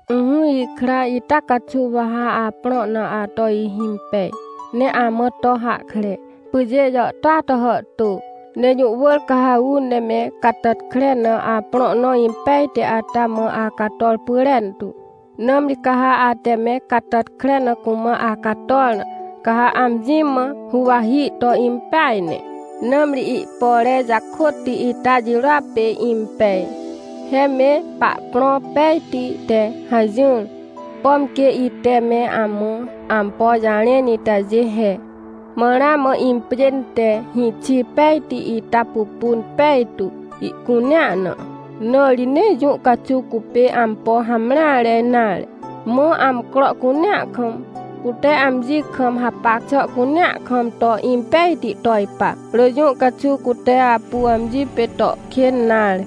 Ỹhỹ ikra, ita caxuw wa ha aprõ na ato ihimpej, ne amã to hahkre. Pyjê jàhtôa to hàhtô, ne jũ wỳr ca ha uu ne me catàtkre na aprõ nõ impejti ata mã acator pyrentu. Nãmri ca ha ate me catàtkre na cumã acator na, ca ha amji mã huwahi to impeaj ne, nãmri ihpore jakôtti ita jirôa pê impej. He me pahprõ pejti te hajỹr, pom quê ite me amã ampo jarẽn itajê he. Mã ramã impjên te hĩxi pejti ita pupun pejtu ihcunea na, na ri nee jũ caxuw cupê ampo hamreare nare. Mã amcro cunea kam, cute amji kam hapac xà cunea kam to impejti to ipa, rỳ jũ caxuw cute apu amji pê to kên nare.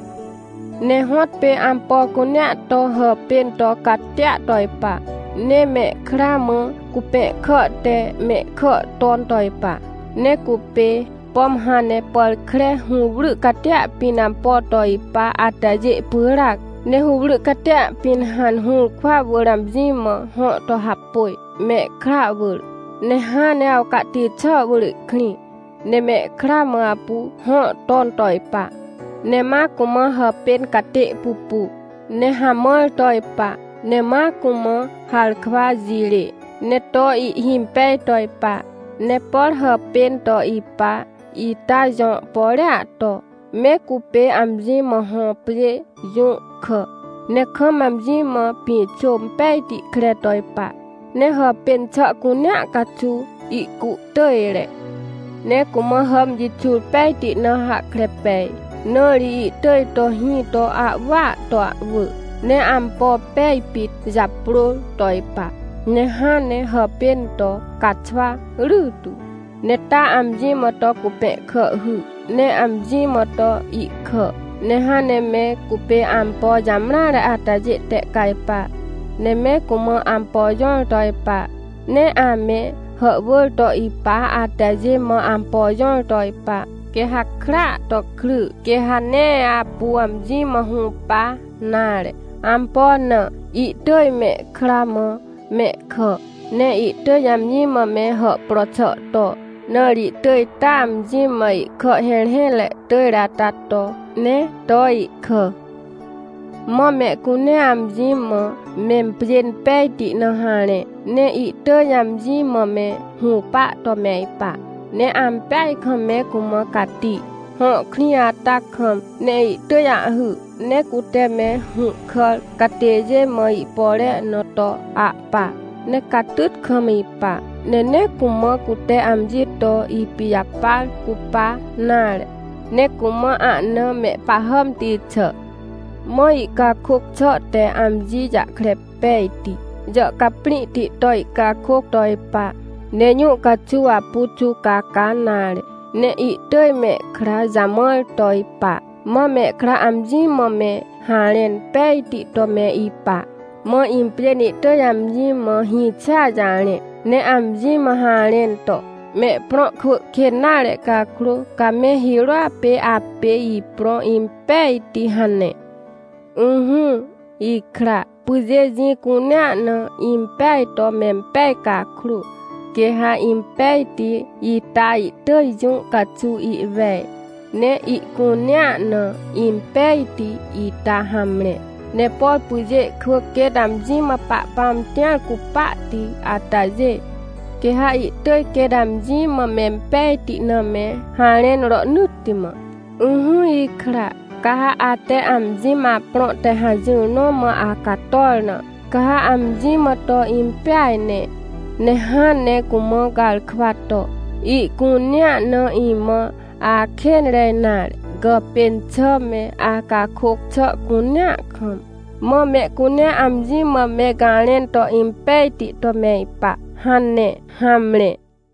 Ne hõtpê ampo cunea to hàpên to catia to ipa, ne mehkra mã cupẽhkà te mehkà ton to ipa. Ne cupê, pom hãn ne pàr kre hũwry catia pĩn ampo to ipa atajê pyràac, ne hũwry catia pĩn hãn ne hũrkwa wỳr amji mã hõ to hapôj, mehkra wỳr. Ne hãn ne awcahti xà wỳr ihkrĩ, ne mehkra mã apu hõ ton to ipa. Ne ma cumã hàpên catê pupu, ne hamãr to ipa, ne ma cumã harkwa jirê, ne to ihhimpej to ipa. Ne por hàpên to ipa ita jõ porea to, me cupê amji mã hõ pjê jũhkà, ne kam amji mã pĩxô pejti kre to ipa. Ne hàpên xà cunea caxuw ihcuhtỳjre. Ne cumã hàmjixur pejti na hahkre pej. Na ri ihtỳj to hĩ to ahwỳa to ahwỳ. Ne ampo pej pit japrôr to ipa, ne hãn ne hàpên to caxwa rytu. Ne taa amji mã to cupẽhkà hy, ne amji mã to ihkà. Ne hãn ne me cupê ampo jamreare atajê tehcajpa, ne me cumã ampo jõr to ipa, ne ame hàhwỳr to ipa atajê mã ampo jõr to ipa. Quê ha krya to kry, quê ha nee apu amji mã hũpa nare. Ampo na? Ihtỳj mehkra mã mehkà. Ne ihtỳj amji mã me hàhpro xà to, na ri ihtỳj taa amji mã ihkà hẽrhẽtre tỳjre ata to, ne to ihkà. Mã mehcunea amji mã mempjên pejti na harẽ, ne ihtỳj amji mã me hũpa to me ipa. Ne ampeaj kam me cumã cati, hõ krĩ ata kam. Ne ihtỳj ahhy, ne cute me hũhkàr catêjê mã ihpore na to ahpa. Ne catyt kam ipa. Ne nee cumã cute amji to ipijapar cupa nare, ne cumã ahna mehpahàmti xà. Mã ihcakôc xà te amji jahkre pejti, jàhcaprĩhti to ihcakôc to ipa. Ne jũ caxuw apu xuwcaca nare, ne ihtỳj mehkra jamãr to ipa. Mã mehkra amji mã me harẽn pejti to me ipa. Mã impjên ihtỳj amji mã hĩxia jarẽ, ne amji mã harẽn to: — Mehprõ kwỳ kên nare cakrô, ca me hirôa pê apê iprõ impejti — hane. Ỹhỹ, ikra, pyjê jĩ cunea na impeaj to mempej cakrô, quê ha impejti ita ihtỳj jũ caxuw ihwej, ne ihcunea na impejti ita hamre. Ne por pyjê kwỳ quêt amji mã Pahpãm tĩar cupahti atajê, quê ha ihtỳj quêt amji mã mempejti na me harẽn rohnỳtti mã. Ỹhỹ ikra, ca ha ate amji mã aprõ te hajỹr nõ mã acator na, ca ha amji mã to impeaj ne, ne hãn ne cumã garkwa to: — Ihcunea na imã akênre nare gàpên xà me, acakôc xà cunea kam. Mã mehcunea amji mã me garẽn to impejti to me ipa — hane. Hamre.